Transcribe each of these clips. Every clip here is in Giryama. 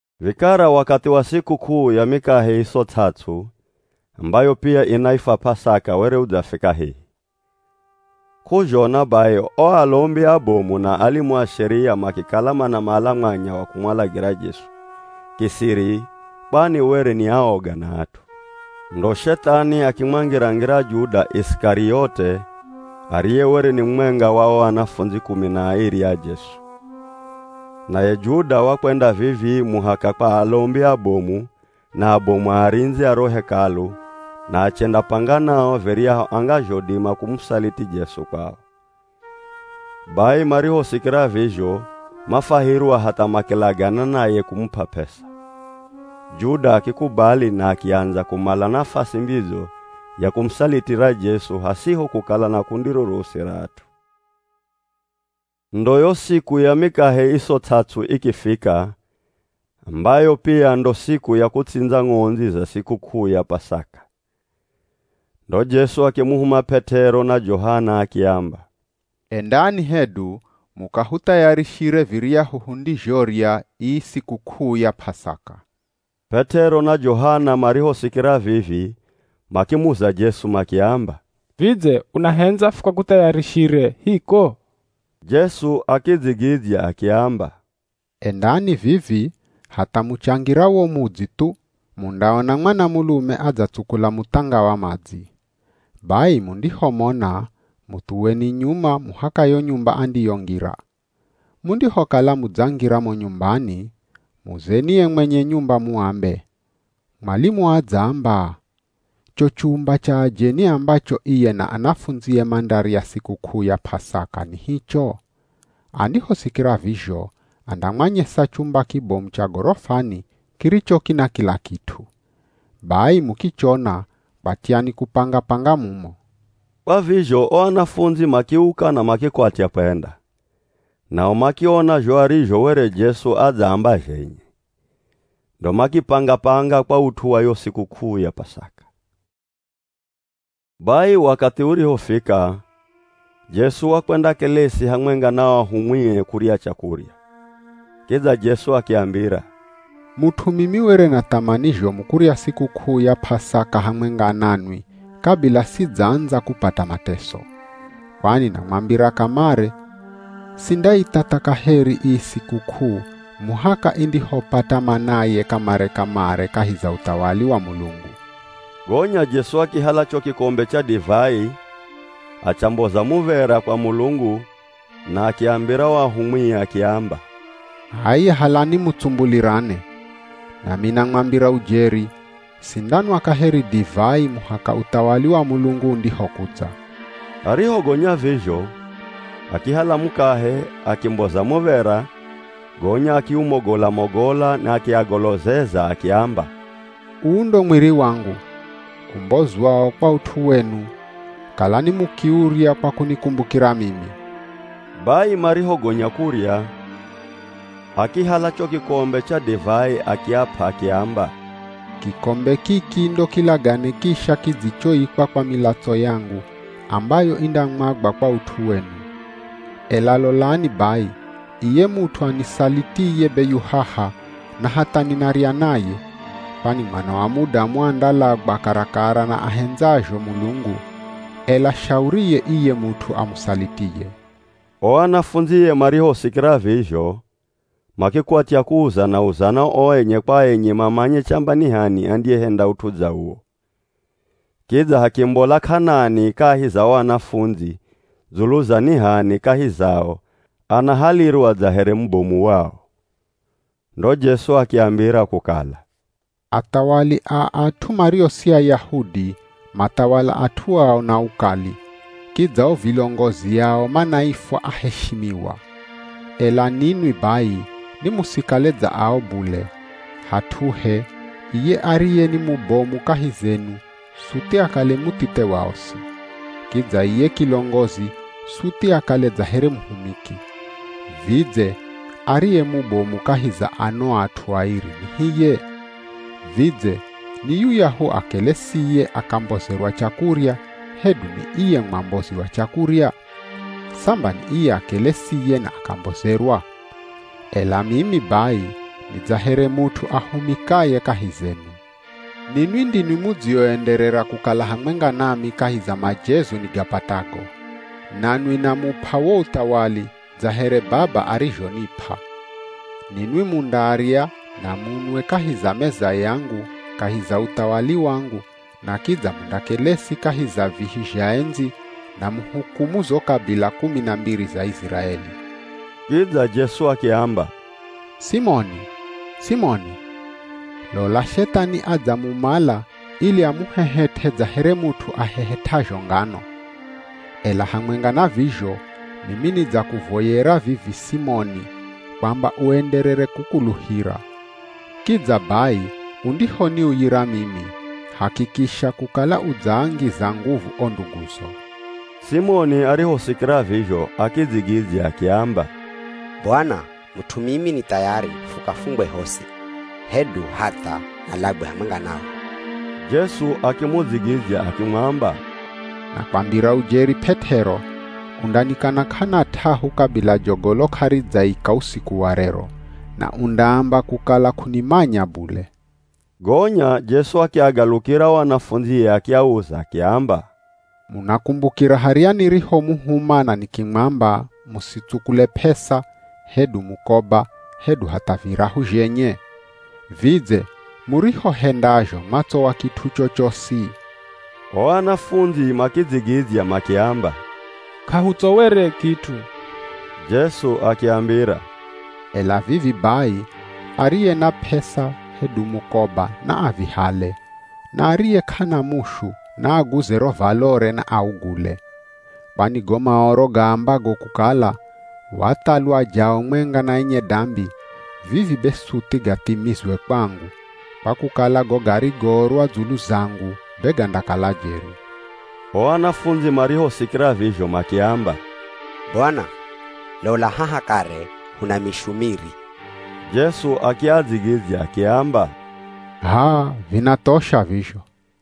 Vikara wakathi wa sikuk'uu ya Mikahe Iso Ts'ats'u ambayo pia inaifwa P'asaka were udzafika hehi. K'uzhona bai o alombi abomu na alimu a Sheria makikala manamala mwanya wa kumwalagira Jesu kisiri kwani were ni aoga na at'u. Ndo Shethani akimwangira-ngira Juda Isikariote ariye were ni mumwenga wa o anafundzi kumi na airi a Jesu. Naye Juda wakwenda vivii muhaka kwa alombi abomu na abomu a arindzi a ro Hekalu na achendapanga nao viryahu angazhodima kumusaliti Jesu kwao. Bai marihosikira vizho mafwahirwa hatha makilagana naye kumup'a p'esa. Juda akikubali na akiandza kumala nafasi mbidzo ya kumusalitira Jesu hasiho kukala na kundi rorosi ra at'u. Ndo yo siku ya Mikahe Iso Ts'ats'u ikifika ambayo pia ndo siku ya kutsindza ng'ondzi za sikuk'uu ya P'asaka. Ndo Jesu akimuhuma P'et'ero na Johana akiamba, “Endani hedu mukahuthayarishire viryahu hundizhorya ii sikuk'uu ya P'asaka.” P'et'ero na Johana marihosikira vivi makimuza Jesu makiamba, “Vidze, unahendza fukakuthayarishire hiko?” Jesu akidzigidzya akiamba, “Endani vivi hatha muchangira wo mudzi thu mundaona mwanamulume adzatsukula muthanga wa madzi, bai mundihomona muthuweni nyuma muhaka yo nyumba andiyongira. Mundihokala mudzangira mo nyumbani, muzeni ye mwenye nyumba muambe, ‘Mwalimu adzaamba, cho chumba cha ajeni ambacho iye na anafundzie mandarya sikuk'uu ya P'asaka ni hicho?’ Andihosikira vizho andamwanyesa chumba kibomu cha gorofani kiricho kina kila kit'u. Bai mukichona kwatyani kupanga-panga mumo.” Kwa vizho o anafundzi makiuka na makikwatya kwenda, nao makiona zho arizho were Jesu adzaamba zhenye. Ndo makipanga-panga kwa ut'u wa yo sikuk'uu ya P'asaka. Bai wakathi urihofika, Jesu wakwendakelesi hamwenga na o ahumwie kurya chakurya. Kidza Jesu akiambira, “Mut'u mimi were na thamani zhomu kurya sikuk'uu ya P'asaka hamwenga nanwi kabila sidzaandza kupata mateso! Kwani namwambira kamare sindaithatha kaheri ii sikuk'uu muhaka indihopata manaye kamare-kamare kahi za uthawali wa Mulungu.” Gonya Jesu akihala cho kikombe cha divai achamboza muv̱era kwa Mulungu na akiambira o ahumwie akiamba, “H'aya halani mutsumbulirane. Nami namwambira ujeri, sindanwa kaheri divai muhaka uthawali wa Mulungu undihokudza.” Arihogonya vizho akihala mukahe, akimboza muv̱era, gonya akiumogola-mogola na akiagolozeza akiamba, “Uu ndo mwiri wangu [umbozwao kwa ut'u wenu, kalani mukiurya kwa kunikumbukira mimi.” Bai marihogonya kurya, akihala cho kikombe cha divai akiap'a, akiamba, “Kikombe kiki ndo kilagane kisha kidzichoikwa kwa milatso yangu ambayo indamwagwa kwa ut'u wenu.] Ela lolani bai iye mut'u anisalitiye be yu haha, na hatha ninarya naye. Kwani Mwana wa Mudamu andalagwa karakara na ahendzazho Mulungu, ela shauriye iye mut'u amusalitiye.” O anafundzie marihosikira vizho makikwatya kuuzana-uzana o enye kwa enye mamanye chamba ni h'ani andiyehenda ut'u dza uwo. Kidza hakimbola k'anani kahi za o anafundzi dzulu za ni h'ani kahi zao anahalirwa dza here mubomu wao. Ndo Jesu akiambira kukala, “Athawali a at'u mario si Ayahudi mathawala at'u ao na ukali, kidza o vilongozi ao manaifwa, ‘Aheshimiwa.’ Ela ninwi bai ni musikale dza ao bule. Hat'uhe, iye ariye ni mubomu kahi zenu suthi akale muthithe wa osi. Kidza iye kilongozi suthi akale dza here muhumiki. Vidze ariye mubomu kahi za ano at'u airi ni hiye? Vidze ni yuyahu akelesiye akambozerwa chakurya hedu ni iye mwambozi wa chakurya? Samba ni iye akelesiye na akambozerwa. Ela mimi bai ni dza here mut'u ahumikaye kahi zenu. Ninwi ndinwi mudzioenderera kukala hamwenga nami kahi za majezo nigapatago. Nanwi namup'a wo uthawali dza here Baba arizhonip'a. Ninwi mundarya na munwe kahi za meza yangu kahi za uthawali wangu na kidza mundakelesi kahi za vihi zha endzi na muhukumu zo kabila kumi na mbiri za Iziraeli.” Kidza Jesu akiamba, “Simoni, Simoni! Lola Shethani adzamumala ili amuhehet'e dza here mut'u ahehet'azho ngano. Ela hamwenga na vizho mimi nidzakuvoyera vivi Simoni kwamba uenderere kukuluhira. Kidza bai undihoniuyira mimi, hakikisha kukala udzaangiza nguvu o nduguzo.” Simoni arihosikira vizho akidzigidzya akiamba, “Bwana, mut'u mimi ni thayari fukafungwe hosi hedu hatha nalagwe hamwenga nawe.” Jesu akimudzigidzya akimwamba, “Nakwambira ujeri P'et'ero, undanikana k'ana t'ahu kabila jogolo k'aridzaika usiku wa rero, na undaamba kukala k'unimanya bule.” Gonya Jesu akiagalukira o anafundzie akiauza akiamba, “Munakumbukira harya nirihomuhuma na nikimwamba, musitsukule p'esa, hedu mukoba hedu hatha virahu zhenye? Vidze murihohendazho mwatsowa kit'u chochosi?” O anafundzi makidzigidzya makiamba, “K'ahutsowere kit'u.” Jesu akiambira, “Ela vivi bai ariye na p'esa hedu mukoba na avihale, na ariye k'ana mushu naaguze ro valore na augule. Kwani go Maoro gaambago kukala, ‘Wathalwa jao mwenga na enye dambi,’ vivi be suthi gathimizwe kwangu. Kwa kukala go garigoorwa dzulu zangu be gandakala jeri.” O anafundzi marihosikira vizho makiamba, “Bwana! Lola haha kare huna mishu miri.” Jesu akiadzigidzya akiamba, “H'aa, vinathosha vizho.”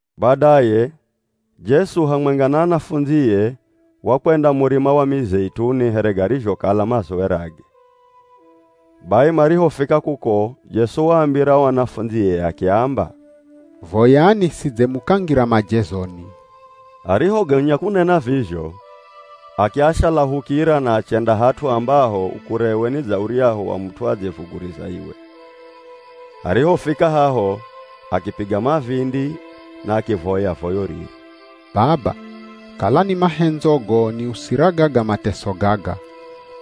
Badaye Jesu hamwenga na anafundzie wakwenda Murima wa Mizeituni here garizhokala mazowerage. Bai marihofika kuko Jesu waambira o anafundzie akiamba, “Voyani sidze mukangira majezoni.” Arihogonya kunena vizho akiashalahukira na achenda hat'u ambaho ukurewe ni dza uryahu wa mut'u adzevuguriza iwe. Arihofika haho akipiga mavindi na akivoya voyo riri, “Baba, kala ni mahendzogo niusira gaga mateso gaga,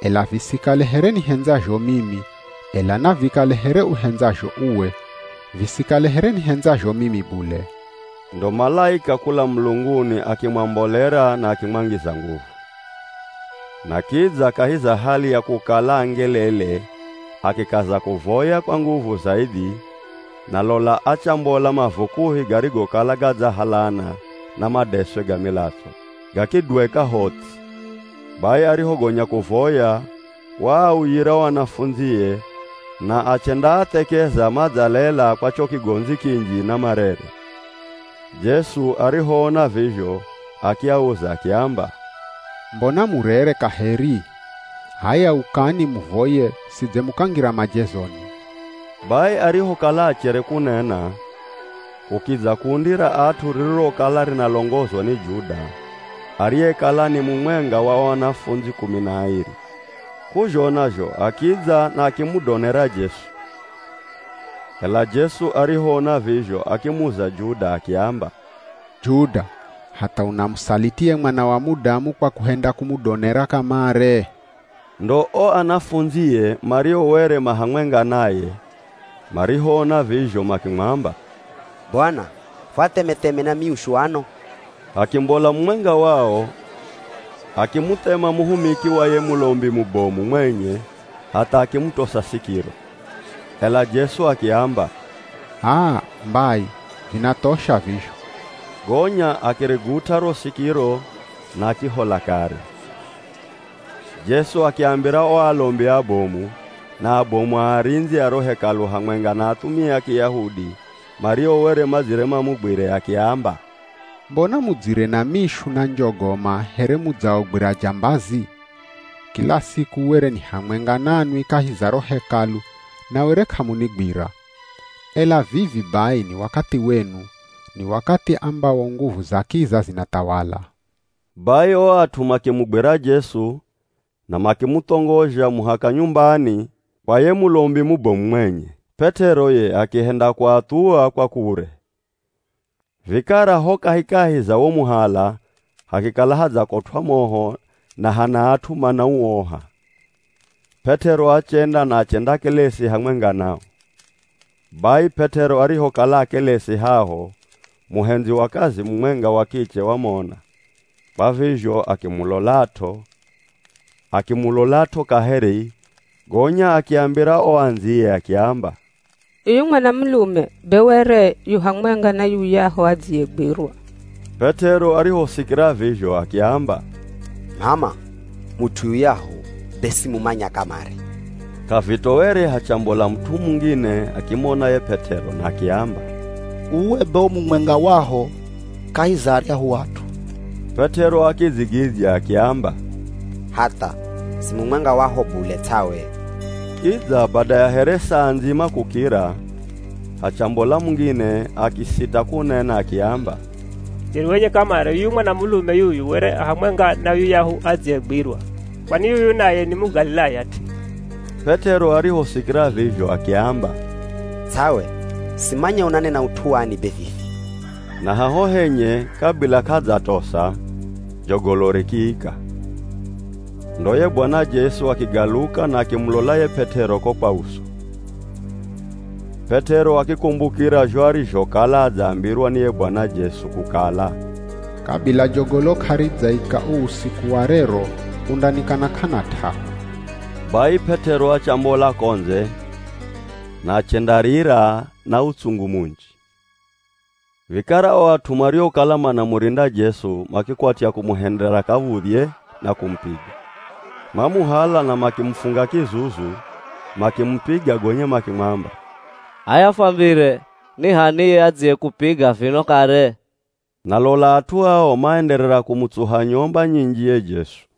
ela visikale here nihendzazho mimi, ela navikale here uhendzazho uwe, visikale here nihendzazho mimi bule.” [ Ndo malaika kula mulunguni akimwambolera na akimwangiza nguvu. Na kidza kahi za hali ya kukala angelele akikaza kuvoya kwa nguvu zaidhi, na lola achambola mavukuhi garigokala gadzahalana na madeswe ga milatso, gakidweka ho ts'i.] Bai arihogonya kuvoya waauyira o anafundzie na achendaathekeza madzalela kwa cho kigondzi kinji na marere. Jesu arihoona vizho akiauza akiamba, “Mbona murere kaheri? H'aya ukani muvoye sidze mukangira majezoni.” Bai arihokala achere kunena, kukidza kundi ra at'u ririrokala rinalongozwa ni Juda, ariyekala ni mumwenga wa o anafundzi kumi na airi. K'uzhona zho akidza na akimudonera Jesu. Ela Jesu arihoona vizho akimuza Juda akiamba, “Juda hatha unamusaliti ye Mwana wa Mudamu kwa kuhenda kumudonera kamare?” Ndo o anafundzie mario were ma hamwenga naye marihoona vizho makimwamba, “Bwana! Fuatheme-theme na myushu ano?” Hakimbola mumwenga wao, akimuthema muhumiki wa ye Mulombi mubomu mwenye hatha akimutosa sikiro. Ela Jesu akiamba, “Aa! Mbai, vinathosha vizho.” Gonya akirigut'a ro sikiro na akihola kare. Jesu akiambira o alombi abomu, na abomu a arindzi a ro Hekalu hamwenga na athumia a Kiyahudi mario were madzire mamugwire, akiamba, “Mbona mudzire na mishu na njogoma here mudzaogwira jambazi? Kila siku were ni hamwenga nanwi kahi za ro Hekalu na were k'amunigwira. Ela vivi bai ni wakathi wenu, ni wakathi ambawo nguvu za kiza zinathawala.” Bai o at'u makimugwira Jesu na makimuthongozha muhaka nyumbani kwa ye Mulombi mubomu mwenye. P'et'ero ye akihenda kuathuwa kwa kure. Vikara ho kahikahi za wo muhala hakikala hadzakotw'a moho na hana at'u manauoha. P'et'ero achenda na achendakelesi hamwenga nao. Bai P'et'ero arihokala akelesi haho muhendzi wa kazi mumwenga wa kiche wamona, kwa vizho akimulolat'o, akimulolat'o kaheri gonya akiambira o andziye akiamba, “Yuyu mwanamulume be were yu hamwenga na yuyahu adziyegwirwa!” P'et'ero arihosikira vizho akiamba, “M'ama, mut'u yuyahu be simumanya kamare!” K'avitoere hachambola mut'u mungine akimona ye P'et'ero na akiamba, “Uwe be u mumwenga waho kahi za aryahu at'u.” P'et'ero akidzigidzya akiamba, “Hatha. Si mumwenga waho bule ts'awe!” Kidza bada ya here saa ndzima kukira, hachambola mungine akisita kunena akiamba, “Jeri wenye kamare yuyu mwanamulume yuyu were a hamwenga na yuyahu adziyegwirwa. Kwani yuyu naye ni Mugalilaya t'i.” P'et'ero arihosikira vizho akiamba, “Ts'awe, simanya unanena ut'u wani be vivi.” Na haho henye, kabila k'adzatosa, jogolo rikiika. Ndo ye Bwana Jesu akigaluka na akimulola ye P'et'ero ko kwa uso. P'et'ero akikumbukira zho arizhokala adzambirwa ni ye Bwana Jesu, kukala, “kabila jogolo k'aridzaika uu usiku wa rero, undanikana k'ana t'ahu.” Bai P'et'ero achambola ko ndze na achendarira na utsungu munji. Vikara o at'u mariokala manamurinda Jesu makikwatya kumuhendera kav̱udhye na kumupiga. Mamuhala na makimufunga kizuzu, makimupiga gonya makimwamba, “H'aya fwambire! Ni h'ani ye adziyekupiga vino kare?” Na lola at'u ao maenderera kumutsuha nyomba nyinji ye Jesu.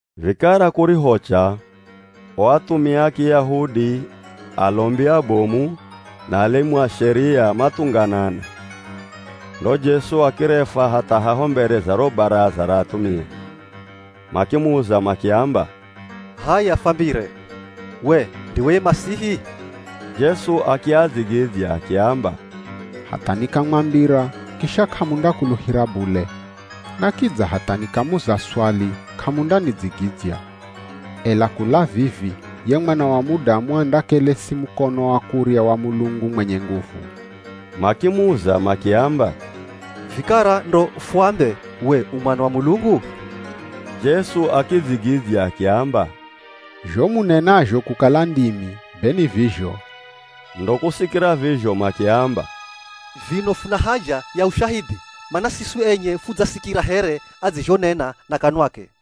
Vikara kurihocha, o athumia a Kiyahudi, alombi abomu na alimu a Sheria mathunganana. Ndo Jesu akirefwa hatha haho mbere za ro Baraza ra athumia. Makimuza makiamba, “H'aya fwambire, we ndiwe ye Masihi?” Jesu akiadzigidzya akiamba, “Hatha nikamwambira kisha k'amundakuluhira bule, na kidza hatha nikamuza swali k'amundanidzigidzya. Ela kula vivi ye Mwana wa Mudamu andakelesi mukono wa kurya wa Mulungu mwenye nguvu.” Makimuza makiamba, “Vikara ndo fuambe we u Mwana wa Mulungu?” Jesu akidzigidzya akiamba, “Zho munenazho kukala ndimi be ni vizho.” Ndo kusikira vizho makiamba, “Vino funa haja ya ushahidhi? Mana siswi enye fudzasikira here adzizhonena na kanwake!”